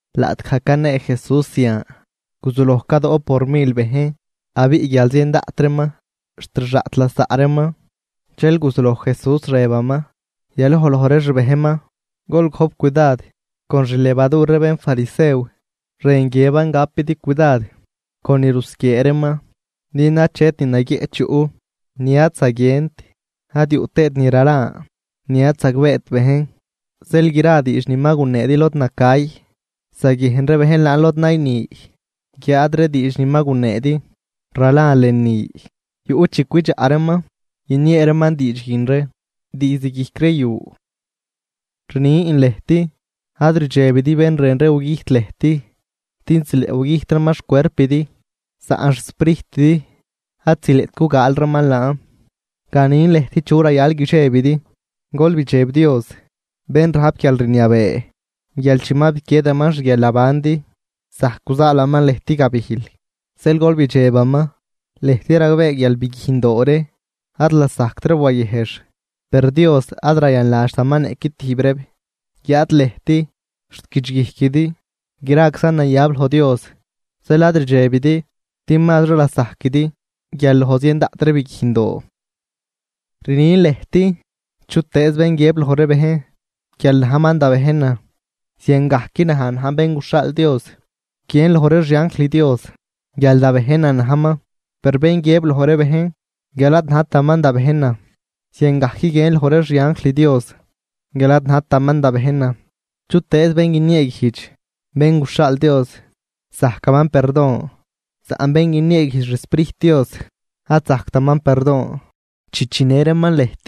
Laꞌtgaj canee Jesús zian, guzuloj cadoꞌp por mil bejn, abiꞌ guial zien daꞌt reeman xt rxaꞌt lasaꞌ reeman. Dxel guzuloj Jesús rëbaman yaloj loj ree xbejnman: ―Gol gojp cudad con xlevadur ree bénfarisew, rën guiëban gapidi cudad con ni rusquiee reeman. Din achet ni naguieꞌch yuꞌ ni ad zaguient, ad yuꞌ tëët ni ralan ni ad zagbeet bejn. Zeel gra diidx ni ma guneedi lod nacay, zaguiejn ree bejn laan lod nayni. Guiáad ree diidx ni ma guneedi ralan lënü, yuꞌ chi cwidxaꞌ reeman guiniee reeman diidx guin ree diizd guijc ree yu. ’Rnin lëjt, ad ridxebidi bén rën ree gugüjt lëjt din zileꞌ gugüjt reeman xcuerpidi, saꞌn xsprijtidi ad zileꞌt gugaal reeman laan. Ganin lëjt chu rayal guidxebidi: gol bidxeb Dios bén rajp guialrniabee guial chi ma biquiedaman xguialnabandi zajc guzaalaman lëjt gabijl. Zeel gol bidxebaman. ’Lëjt ragbee guial biguijndoo ree ad lasajct reeb wayëjx, per Dios ad rayanladxtaman niꞌqui tijb reeb. Guiáad lëjt xt guidxguijquidi, graczan nayab loj Dios. Zeel ad rdxebidi din mazri lasajquidi guial loj zien daꞌt ree biguijndoo. ’Rnin lëjt, chutëëz bén guiëb loj ree bejn guial najman da bejnan, ziangajc naj najn Bén guxhaal Dios guiën loj ree xianjl Dios guial da bejnan najman. Per bén guiëb loj ree bejn guial ad najtaman da bejnan, ziangajc guiën loj ree xianjl Dios guial ad najtaman da bejnan. ’Chutëëz bén guinieeguijdx Bén guxhaal Dios zajcaman perdon, saꞌn bén guinieeguijdx xSprijt Dios, ad zajctaman perdon. ’Chi chinë reeman lëjt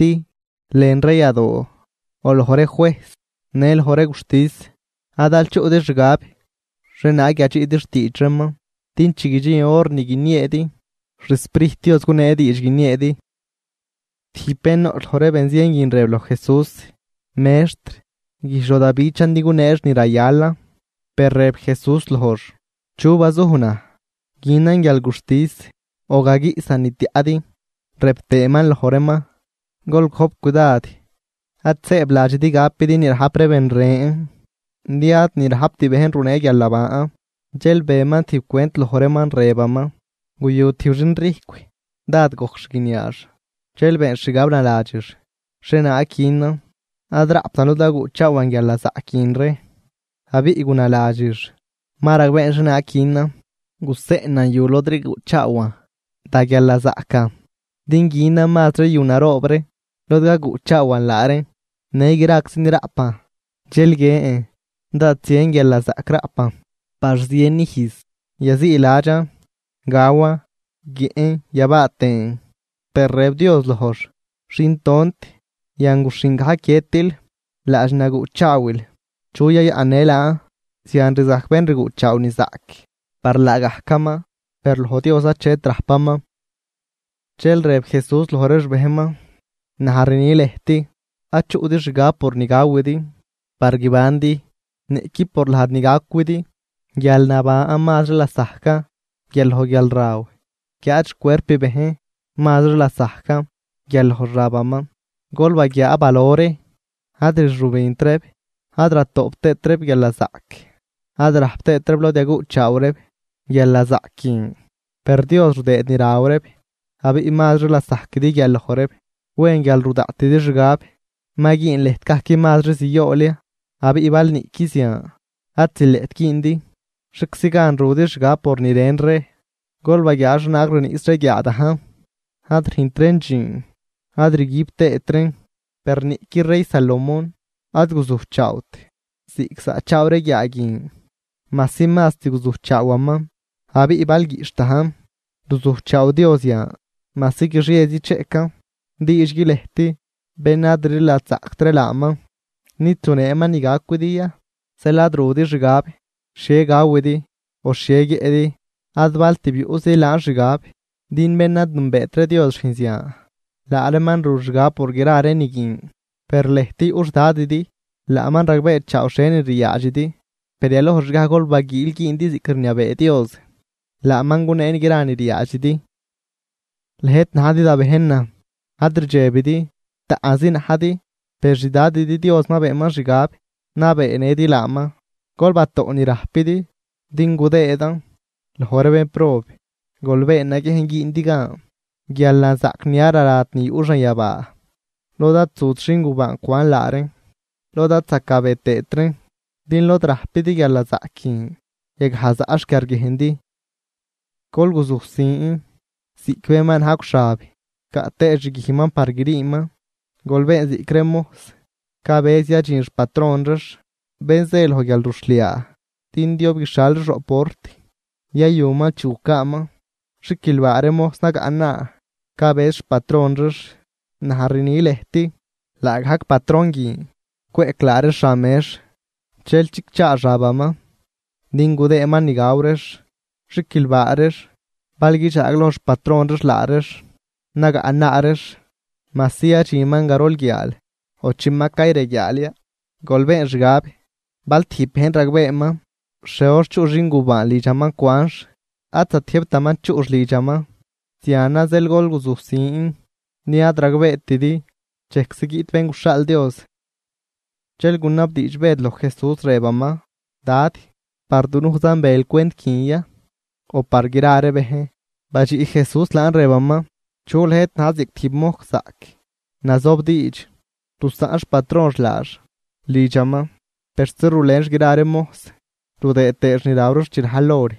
lën ree yadoo o loj ree juejs në loj ree guxtis, ad aal chuꞌdi xgab xhienaag yadxiꞌdi xtiidx reeman. Din chi guidxin hor ni guinieedi, xSprijt Dios gunee diidx guinieedi. Tijb bén noꞌch loj ree benzien guin rëb loj Jesús: ―Mextr, güjdx loj da bichan din guneex ni rayalan. Per rëb Jesús lojx: ―¿Chu bazuj naj günan guialguxtis o gaguiꞌsan ni tiaꞌdi? Rëb tëëman loj reeman: ―Gol gojp cudad; ad sëëbladxidi gapidi ni rajp ree ben ren, din ad ni rajpt bejn runee guialnaban. Dxel beman tijb cwent loj reeman, rëbaman: ―Guyu tijb xinrijcw, dád gojc xguiniaax. Dxel beenx xgab naladxix: “¿Xhienaag günan? Ad raꞌptan lod gaguꞌchaawan guialnazaꞌc guin ree.” Abiꞌ gunaladxix: “Ma ragbeen xhienaag günan. Guseꞌnan yu lod rguꞌchaawan da guialnazaꞌcan din günan mazri yu naroob ree lod gaguꞌchaawan laa reen, në graczi ni raꞌpan. Dxel guiën, dád zien guialnazaꞌc raꞌpan par zien ijz, yaziiladxan, gawan, guiëꞌn yabaa tëën.” Per rëb Dios lojx: “Xin tont, yanguxhin gajc guiëtil, laadx ni naguꞌchaawil, ¿chu yayaꞌnnë laan?” Zian rzajc bén rguꞌchaaw ni zaꞌc par laagajcaman, per loj Dios achet rajpaman. Dxel rëb Jesús loj ree xbejnman: ―Naj rni lëjt: Ad chuꞌdi xgab por ni gawidi par guibandi niꞌqui por lajd ni gacwidi. Guialnaban mazri lasajcan guial loj guialraw, guiáad xcuerp bejn mazri lasajcan guial loj xabaman. ¡Gol baguiaa balo ree! Ad rxübint reeb ad ratoꞌp tëët reeb guialnazaꞌc, ad rajp tëët reeb lod yaguꞌchaaw reeb guialnazaꞌc guin, per Dios rudëëd ni raw reeb. ¡Abiꞌ mazri lasajquidi guial loj reeb! ¿Wen guial ru daꞌtidi xgab ma güün lëjt gajc mazri ziool ya? Abiꞌ bal niꞌqui zian ad zileꞌt güündi, ¿xhieczi gan rudi xgab por ni ren ree? ’¡Gol baguiaa xhienaag riniꞌs ree guiaa dajn! Ad rüjnt reen dxiin ad rguib tëët reen. Per niꞌqui rey Salomón ad guzujchaawt ziꞌc zaꞌchaaw ree guiaa guin, majsi mast guzujchaawaman. Abiꞌ bal guiꞌxh dajn ruzujchaaw Dios yan, majsi guixiezi cheꞌcan. ¡Diidxgui lëjt, bén ad rliladxzaꞌct ree laaman nid zuneeman ni gacwidi ya! Zeel ad rudi xgab xhie gawidi o xhie guiëꞌdi, ad bal tib yuꞌzidi laan xgab. Din bén ad nünbeet ree Dios rüjn zian. Laa reeman ru xgab por gra ree ni guin. Per lëjt yuꞌ xDadidi, laaman ragbeechaaw xhienin riaadxidi. Per yalojxgaj gol baguiil güündi ziꞌc rniabee Dios, laaman gunee gra ni ryaadxidi. ’Lëjt najdi da bejnan, ad rdxebidi. Taꞌnzi najdi, per xDadidi Dios ma beenman xgab nabeenëdi laaman. Gol batoꞌ ni rajpidi din gudëëdan loj ree bénprob. Gol been naguiejn güündi gan guialnazaꞌc ni ad rarat ni yuꞌ xanyabaa, lod ad zut xingubaan cwan laa reen lod ad zacabe tëët reen. Din lod rajpidi guialnazaꞌc guin, yagaj zaꞌ xquiarguiejndi. ’Gol guzujsin ziꞌc bén ma najcw xab caꞌ tëë xguijman par griiman. Gol been ziꞌc ree mojs cabëz yadxin xpatron reex, bén zë loj guialruxhliaa, din diob guixhial reex roꞌ port yayuman chi gucaaman. ¡Xiquilbaa ree mojs nagaꞌnaa cabëz xpatron reex! Naj rni lëjt, laagajc patron guin cweꞌc laa reex xan mex, dxel chicchaa xabaman din gudëëman ni gaw reex. Xiquilbaa reex bal guidxaagloj xpatron reex laa reex nagaꞌnaa reex, majsi yadxinman garol guiaal o chi ma cayreguiaal ya. Gol been xgab, bal tijb bejn ragbeeman xhie hor chuꞌ xingubaan lidxaman cwanx, ad zatiëjbtaman chuꞌx lidxaman. Zianan zeel gol guzujsin din ad ragbeetidi dxejczi guiꞌt Bén guxhaal Dios. Dxel gunabdiidx Bëd loj Jesús, rëbaman: ―Dad, ¿par dunujzan bel cwent guin ya o par gra ree bejn? Badxiꞌ Jesús laan, rëbaman: ―¿Chu lëjt na̱j ziꞌc tijb mojs zaꞌc, nazobdiidx, rusaꞌn xpatronx laax lidxaman persi rulenx gra ree mojs rudëë tëëx ni raw reex chi rajl hor?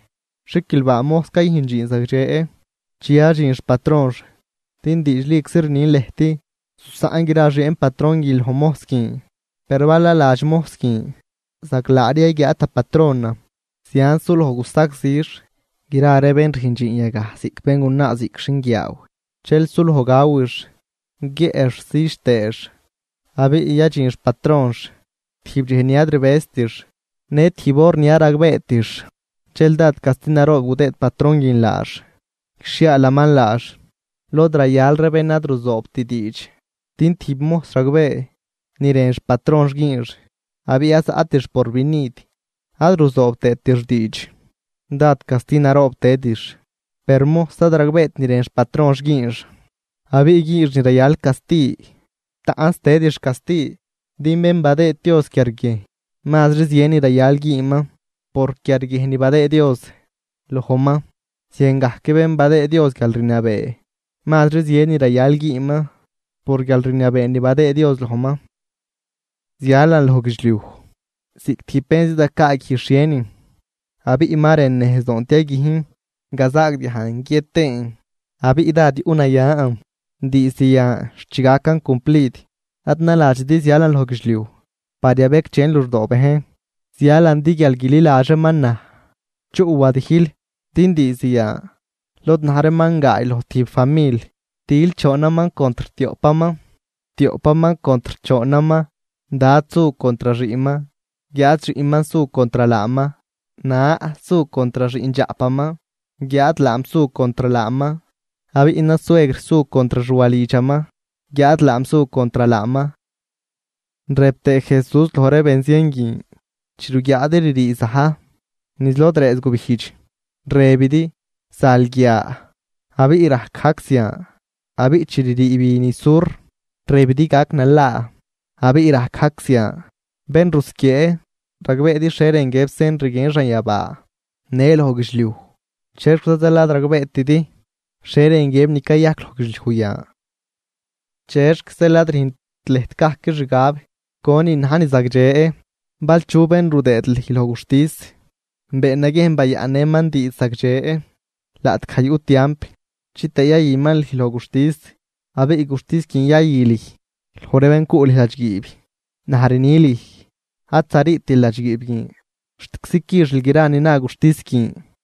Xiquilbaa mojs cayüjn dxiin zagdxe chi yadxin xpatronx. Din diidxliczi rnin lëjt, zusaꞌn gra xieen patron guin loj mojs guin. Per bal naladx mojs guin: “Zaglaari yaguiaad da patronan”, zianz sulojx gusagzix gra ree bén rüjn dxiin yagaj, ziꞌc béngunaa ziꞌc xinguiaaw, dxel suloj gawix, guiëꞌx südx tëëx, abiꞌ yadxin xpatronx tijb dxej ni ad rbëztix në tijb hor ni ad ragbeetix. Dxel dád casti naroob gudëëd patron guin laax, guixhiaalaman laax lod rayal ree bén ad ruzoobt diidx. ’Din tijb mojs ragbee ni rën xpatronx güünx, abiꞌ ad zaꞌtix porvinid ad ruzoob tëëtix diidx, dád casti naroob tëdix. Per mojs ad ragbeet ni rën xpatronx güünx abiꞌ güünx ni rayal casti, taꞌnz tëdix casti. Din bén badëëd Dios quiarguiejn, mazri zien ni rayal güünman por quiarguiejn ni badëëd Dios lojman. Ziangajc bén badëëd Dios guialrniabee, mazri zien ni rayal güünman por guialrniabee ni badëëd Dios lojman. ’Zialan loj guidxliuj ziꞌc tijb bén zidgacaaguij xhienin, abiꞌ ¡ma rën nejzdoon tiaguijn! Gazaagdiajn guiët tëën, abiꞌ ¡dád yuꞌnayan diizd yan xt chi gacan cumplid! Ad naladxidi zialan loj guidxliuj par yabecdxen luxdoo bejn, zialan din guial guililadx reeman naj chuꞌ wadijl. Din diizd yan, lod na̱j reeman gaay loj tijb famil, til choonman contr tioꞌpaman, tioꞌpaman contr choonaman. Dad su contr xiꞌnman guiáad xiꞌnman su contr laaman; na su contr xiꞌndxaꞌpaman guiáad laam su contr laaman; abiꞌ nasuegr su contr xwalidxaman guiáad laam su contr laaman. Rëb tëë Jesús loj ree benzien guin: ―Chi ruguiaadi ririi za̱j niz lod rëëz gubijdx, rëbidi: zal guia, abiꞌ rajc gajc zian. Abiꞌ chi ririi bi niz sur, rëbidi: gac nalaa, abiꞌ rajc gajc zian. ¡Bén rusquiee! Ragbeedi xhie rën guiëb sen rguien xanyabaa në loj guidxliuj, ¿chexquiza zeel ad ragbeetidi xhie rën guiëb ni cayajc loj guidxliuj yan? ’¿Chexc ad rüjnt lëjt gajc xgab conin na̱j ni zagdxe? Bal chu bén rudëëd lüj loj guxtis, been naguiejn bayaꞌnnëman diidx zagdxe laꞌtgaj yuꞌ tiamp, chitëë yayüman lüj loj guxtis, abiꞌ guxtis guin yayü lüj loj ree bén cuꞌ lüj ladxguiib. Naj rni lüj, ad zariitil ladxguiib guin xtczi quixil gra ni na guxtis guin.